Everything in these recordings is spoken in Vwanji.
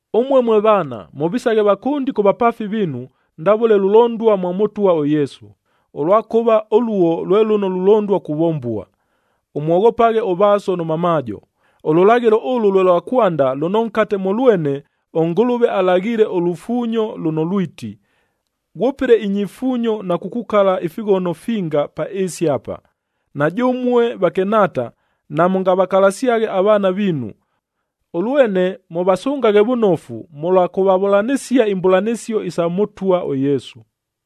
Ʉmue mwe vaana, mʉvisaghe vakʉndi kʉ vapaafi viinu ndavʉle lulondua mwa Mʉtwa ʉYesu, ʉlwakʉva ʉluo lwe lʉno lulondua kuvombua. “Ʉmwoghopaghe ʉvaaso nʉ mamaajo,” ʉlʉlaghɨlo ʉlʉ lwe lwa kwanda lʉno nkate mʉ lwene, ʉNgʉlʉve alaghile ʉlufuunyo lʉno lwiti, “Ghwʉpɨle inyifuunyo na kukukala ifighono finga pa ɨɨsi apa.”a Na jʉmue vakɨnhaata, namʉngavakalasyaghe avaana viinu, ʉlwene mʉvasʉngaghe vʉnofu mʉlwa kʉvavʉlanɨsia imbʉlanɨsio isa Mʉtwa ʉYesu.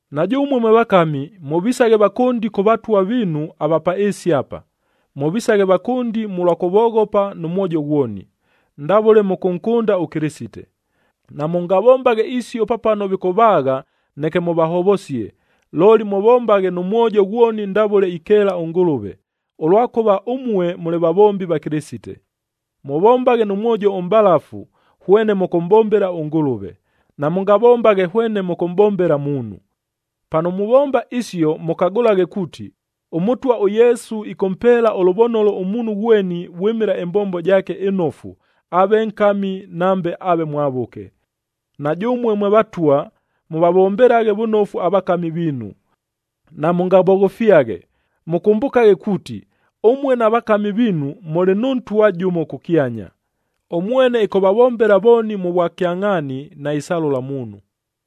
Na jʉmue mwe vakami, mʉvisaghe vakʉndi kʉ vatwab viinu ava pa ɨɨsi apa. Mʉvisaghe vakʉndi mʉlwa kʉvoghopa nʉ mwojo ghwoni, ndavʉle mʉkʉnkʉnda ʉKɨlɨsite. Namʉngavombaghe isio pa pano vikʉvaagha neke mʉvahovosie, looli mʉvombaghe nʉ mwojo ghwoni ndavʉle ikeela ʉNgʉlʉve, ʉlwakʉva ʉmue mʉlɨ vavombi va Kɨlɨsite. Mʉvombaghe nʉ mwojo ʉmʼbalafu, hwene mʉkʉmʼbombela ʉNgʉlʉve, namʉngavombaghe hwene mʉkʉmʼbombela muunhu. Pano muvomba isio mʉkagʉlaghe kuuti, ʉMʉtwa ʉYesu ɨkʉmpeela ʉlʉvonolo ʉmuunhu ghweni vwɨmɨla ɨmbombo jaake ɨnofu, aave nkami nambe aave mwavʉke. Na jʉmue mwe vatwa, mʉvavombelaghe vʉnofu avakami viinu. Namʉngavoghofyaghe, mʉkʉmbʉkaghe kuuti ʉmue na vakami viinu mʉlɨ nʉ Ntwa jʉmo kʉkyanya, ʉmwene ɨkʉvavombela vooni mʉ vwakyangʼhaani, naisalʉla muunhu.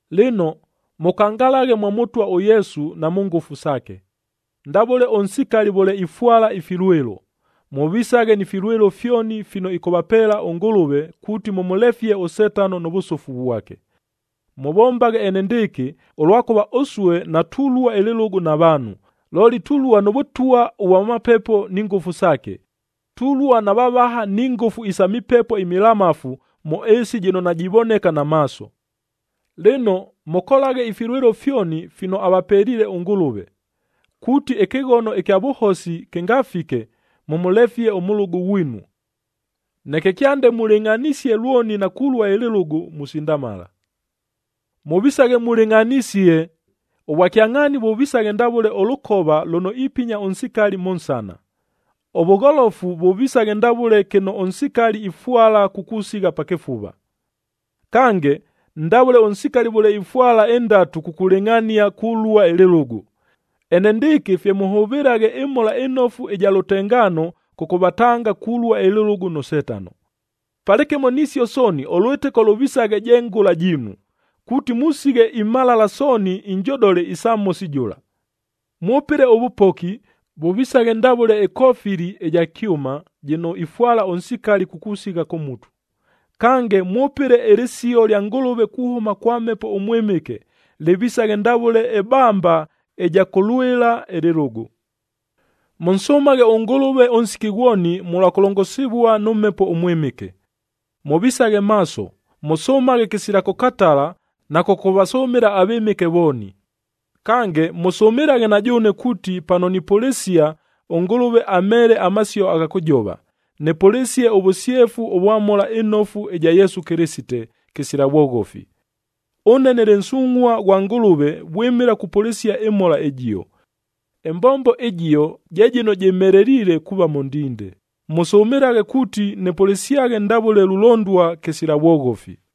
Lɨno, mʉkangalaghe mwa Mʉtwa ʉYesu na mʉ ngʉfu saake. Ndavʉle ʉnsikali vʉle ifwala ifilwɨlo, mʉvisaghe ni filwɨlo fyoni fino ɨkʉvapeela ʉNgʉlʉve kuuti mʉmʉlefie ʉSetano nʉ vʉsʉfu vwake. Mʉvombaghe enendɨɨkɨ, ʉlwakʉva ʉsue natulua ɨlɨlʉgʉ na vaanhu, looli tulua nʉ vʉtwa ʉvwa mapepo ni ngʉfu saake, tulua na vavaha ni ngʉfu isa mipepo imilamafu mʉ ɨɨsi jɨno najivoneka na maaso. Lɨno, mʉkolaghe ifilwɨlo fyoni fino avapeliile ʉNgʉlʉve, kuuti ɨkɨghono ɨkya vʉhosi kɨngafike, mʉmʉlefie ʉmʉlʉgʉ ghwinu. Neke kyande mulɨngʼhanisie lwoni na kulua ɨlɨlʉgʉ, musindamala. Mʉvisaghe mulɨngʼhanisie: Ʉvwakyangʼhaani vʉvisaghe ndavʉle ʉlʉkova lʉno ipinya ʉnsikali mʉ nsana, ʉvʉgholofu vʉvisaghe ndavʉle kɨno ʉnsikali ifwala kukusigha pa kɨfuva. Kange, ndavʉle ʉnsikali vʉle ifwala indatu kukulɨngʼhania kulua ɨlɨlʉgʉ, enendɨɨkɨ fye mʉhʉvɨlaghe ɨMhola ɨNofu ɨja lʉtengaano kʉkʉvatanga kulua ɨlɨlʉgʉ nʉ Setano. Palɨkɨmo nisio sooni, ʉlwɨtɨko lʉvisaghe je ngʉla jiinu, kuuti musighe imhalala sooni injodole isa Mhosi jʉla. Mwʉpɨle ʉvʉpoki, vʉvisaghe ndavʉle ɨkofili ɨja kyʉma jɨno ifwala ʉnsikali kukusigha kʉ mutu; kange mwʉpɨle ɨlɨsio lya Ngʉlʉve kuhʉma kwa Mhepo ʉMwɨmɨke, lɨvisaghe ndavʉle ɨbamba ɨja kʉlwɨla ɨlɨlʉgʉ. Mʉnsʉmaghe ʉNgʉlʉve ʉnsiki ghwoni mʉlwa kʉlongosivua nʉ Mhepo ʉMwɨmɨke. Mʉvisaghe maaso, mʉsʉmaghe kɨsila kʉkatala na kʉkʉvasʉmɨla avɨmɨke vooni. Kange, mʉsʉmɨlaghe na jʉʉne kuuti pano nipʉlɨsia, ʉNgʉlʉve amheele amasio agha kʉjova, nɨpʉlɨsie ʉvʉsyefu ʉvwa Mhola ɨNofu ɨja Yesu Kɨlɨsite, kɨsila vwoghofi. Ʉne nɨlɨ nsungʼhua ghwa Ngʉlʉve vwɨmɨla kupʉlɨsia ɨMhola ɨjio. Ɨmbombo ɨjio je jɨno jɨmheleliile kuuva mʉ ndinde, mʉsʉmɨlaghe kuuti nɨpʉlɨsyaghe ndavʉle lulondua kɨsila vwoghofi.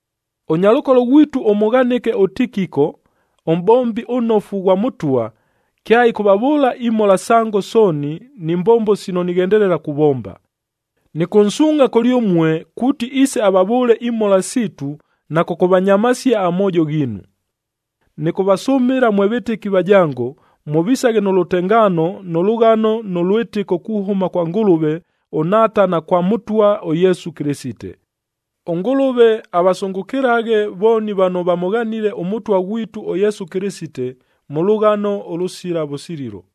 Ʉnyalʉkolo ghwitu ʉmʉghanɨke ʉTikiko, ʉmʼbombi ʉnnofu ghwa Mʉtwa, kyaɨkʉvavʉʉla imhola sango sooni ni mbombo sino nighendelela kuvomba. Nɨkʉnsuungʼha kʉlyʉmue, kuuti iise avavʉʉle imhola siitu na kʉkʉvanyamasia amoojo ghiinu. Nɨkʉvasʉmɨla mwe vɨtɨki vajango, mʉvisaghe nʉ lʉtengaano nʉ lʉghano nʉ lwɨtɨko kuhʉma kwa Ngʉlʉve ʉNhaata na kwa Mʉtwa ʉYesu Kɨlɨsite. ɄNgʉlʉve avasʉngʉkɨlaghe vooni vano vamʉghanile ʉMʉtwa ghwitu ʉYesu Kɨlɨsite, mʉ lʉghano ʉlʉsila vʉsililo.